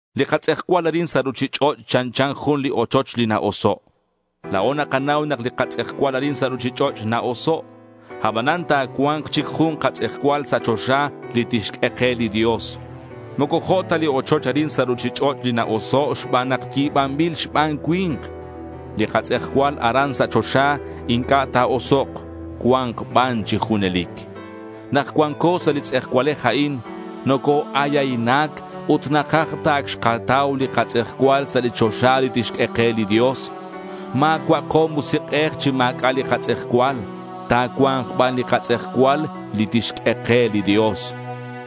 Li katz'ejcual arin sa' ruchich'och' chanchan jun li ochoch li na-oso'. La̱o nakanau nak li katz'ejcual arin sa' ruchich'och' na-oso'. Abanan ta̱cua̱nk chic jun katz'ejcual sa' choxa li tixq'ue ke li Dios. Moco jo' ta li ochoch arin sa' ruchich'och' li na-oso' xban nak yi̱banbil xban cui̱nk. Li katz'ejcual aran sa' choxa inc'a' ta̱osok'. Cua̱nk ban chi junelic. Nak cuanco sa' li tz'ejcualej a'in, noco-ayaynac ut nakaj ta ac xkatau li katz'ejcual sa' li choxa li tixq'ue ke li Dios. Ma̱cua'ako musik'ej chi ma̱c'a' li katz'ejcual. Ta̱cua̱nk ban li katz'ejcual li tixq'ue ke li Dios.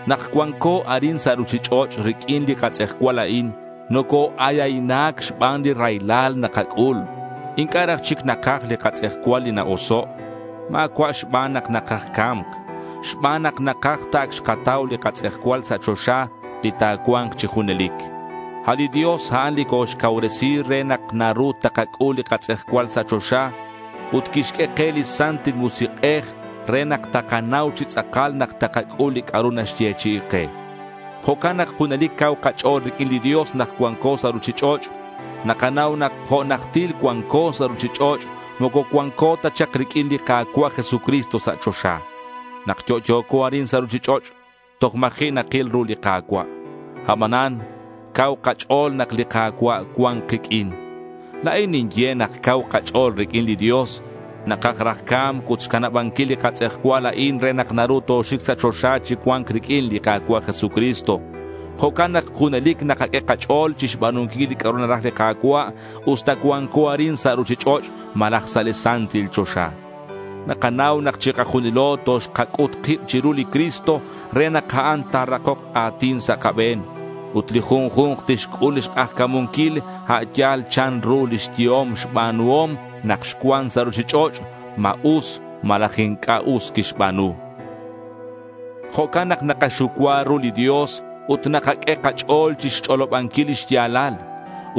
Nak cuanco arin sa' ruchich'och' riq'uin li katz'ejcual a'in, noco-ayaynac xban li raylal nakac'ul. Inc'a' raj chic nakaj li katz'ejcual li na-oso'. Ma̱cua' xban nak nakaj ca̱mc. Xban nak nakaj ta ac xkatau li katz'ejcual sa' choxa li ta̱cua̱nk chi junelic. A' li Dios a'an li coxcauresi re nak naru takac'ul li katz'ejcual sa' choxa. Ut quixq'ue ke li Santil Musik'ej re nak takanau chi tz'akal nak takac'ul li c'a'ru naxyechi'i ke. Jo'can nak junelic cau kach'o̱l riq'uin li Dios nak cuanco sa' ruchich'och'. Nakanau nak jo' najtil cuanco sa' ruchich'och', moco cuanco ta chak riq'uin li Ka̱cua' Jesucristo sa' choxa. Nak yo'yo̱co arin sa' ruchich'och', toj ma̱ji' nakil ru li Ka̱cua'. Abanan cau kach'o̱l nak li Ka̱cua' cuan kiq'uin. La̱in ninye nak cau kach'o̱l riq'uin li Dios. Nakaj raj ca̱mc ut xcanabanquil li katz'ejcual a'in re nak naru toxic sa' choxa chi cua̱nc riq'uin li Ka̱cua' Jesucristo. Jo'can nak junelic nakaq'ue kach'o̱l chixba̱nunquil li c'a'ru naraj li Ka̱cua' usta cuanco arin sa' ruchich'och' malaj sa' li Santil Choxa. Nakanau nak chikajunilo toxkac'ut kib chiru li Cristo re nak a'an ta̱rakok a̱tin sa' kabe̱n. Ut li junju̱nk tixc'ul lix k'ajca̱munquil a' yal chanru lix yehom xba̱nuhom nak xcuan sa' ruchich'och', ma us malaj inc'a' us quixba̱nu. Jo'can nak nakaxucua ru li Dios ut nakaq'ue kach'o̱l chixch'olobanquil lix ya̱lal.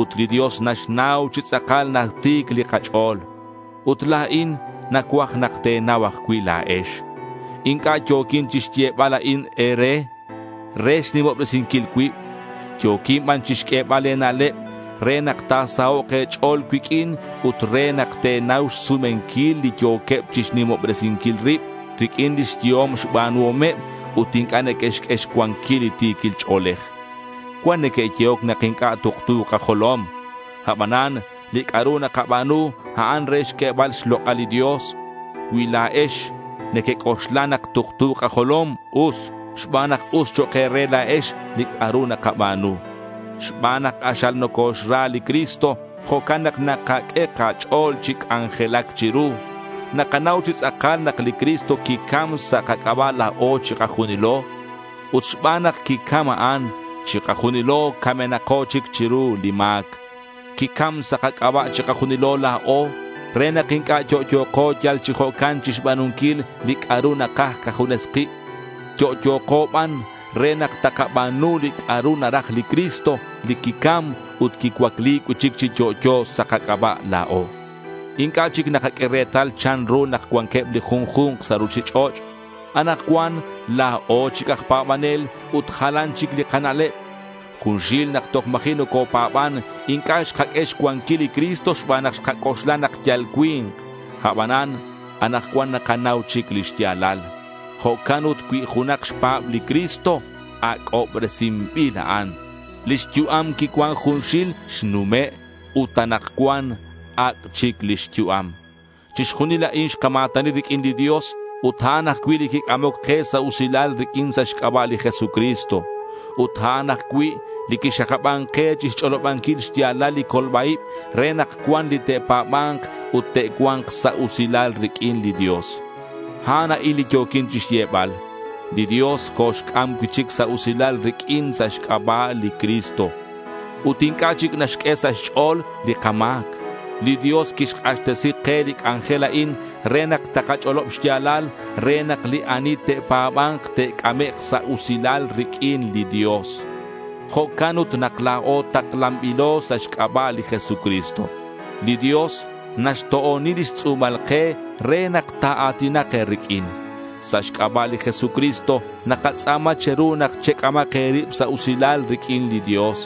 Ut li Dios naxnau chi tz'akal nak ti̱c li kach'o̱l. Ut la̱in nacuaj nak te̱nau ajcui' la̱ex. Inc'a' yo̱quin chixyebal a'in e̱re re xnimobresinquil cuib. Yo̱quin ban chixq'uebal e̱na'leb re nak ta̱sahok' e̱ch'o̱l cuiq'uin ut re nak te̱nau xsumenquil li yo̱queb chixnimobresinquil rib riq'uin lix yehom xba̱nuhomeb ut inc'a' neque'xq'ue xcuanquil li ti̱quil ch'o̱lej. Cuan neque'yehoc nak inc'a' tuktu kajolom. Abanan li c'a'ru nakaba̱nu, a'an re xq'uebal xlok'al li Dios. Cui la̱ex nequec'oxla nak tuktu kajolom, us, xban nak us chok' e̱re la̱ex li c'a'ru nakaba̱nu. Xban nak k'axal nocoxra li Cristo, jo'can nak nakaq'ue kach'o̱l chi c'anjelac chiru. Nakanau chi tz'akal nak li Cristo quicam sa' kac'aba' la̱o chikajunilo. Ut xban nak quicam a'an, chikajunilo camenako chic chiru li ma̱c. Quicam sa' kac'aba' chikajunilo la̱o re nak inc'a' yo'yo̱ko yal chi jo'can chixba̱nunquil li c'a'ru nakaj kajunes kib. Yo'yo̱ko ban re nak takaba̱nu li c'a'ru naraj li Cristo li quicam ut quicuacli cui'chic chi yo'yo sa' kac'aba' la̱o. Inc'a' chic nakaq'ue retal chanru nak cuanqueb li junju̱nk sa' ruchich'och'. Anakcuan la̱o chic aj pa̱banel ut jalan chic li kana'leb. Junxil nak toj ma̱ji' nocopa̱ban inc'a' xkaq'ue xcuanquil li Cristo xban nak xkac'oxla nak yal cui̱nk. Abanan anakcuan nakanau chic lix ya̱lal. Jo'can ut cui junak xpa̱b li Cristo, ac'obresinbil a'an. Lix yu'am quicuan junxil xnume' ut anakcuan ac' chic lix yu'am. Chixjunil a'in xkama̱tani riq'uin li Dios ut a'an ajcui' li quic'amoc ke sa' usilal riq'uin sa' xc'aba' li Jesucristo. Ut a'an ajcui' li quixakaban ke chixch'olobanquil xya̱lal li colba-ib re nak cuan li te'pa̱ba̱nk ut te'cua̱nk sa' usilal riq'uin li Dios. A'an a'in li yo̱quin chixyebal: Li Dios coxc'am cui'chic sa' usilal riq'uin sa' xc'aba' li Cristo. Ut inc'a' chic naxq'ue sa' xch'o̱l li kama̱c. Li Dios quixk'axtesi ke li c'anjel a'in re nak takach'olob xya̱lal re nak li ani te'pa̱ba̱nk te'c'amek' sa' usilal riq'uin li Dios. Jo'can ut nak la̱o taklanbilo sa' xc'aba' li Jesucristo. Li Dios naxto'oni lix tz'u̱mal ke re nak ta̱a̱tinak e̱riq'uin. Sa' xc'aba' li Jesucristo nakatz'a̱ma che̱ru nak chec'amak e̱rib sa' usilal riq'uin li Dios.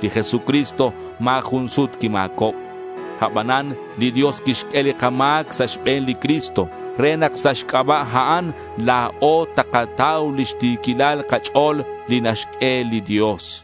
Li Jesucristo ma̱ jun sut quima̱cob. Abanan li Dios quixq'ue li kama̱c sa' xbe̱n li Cristo re nak sa' xc'aba' a'an, la̱o takatau lix ti̱quilal kach'o̱l li naxq'ue li Dios.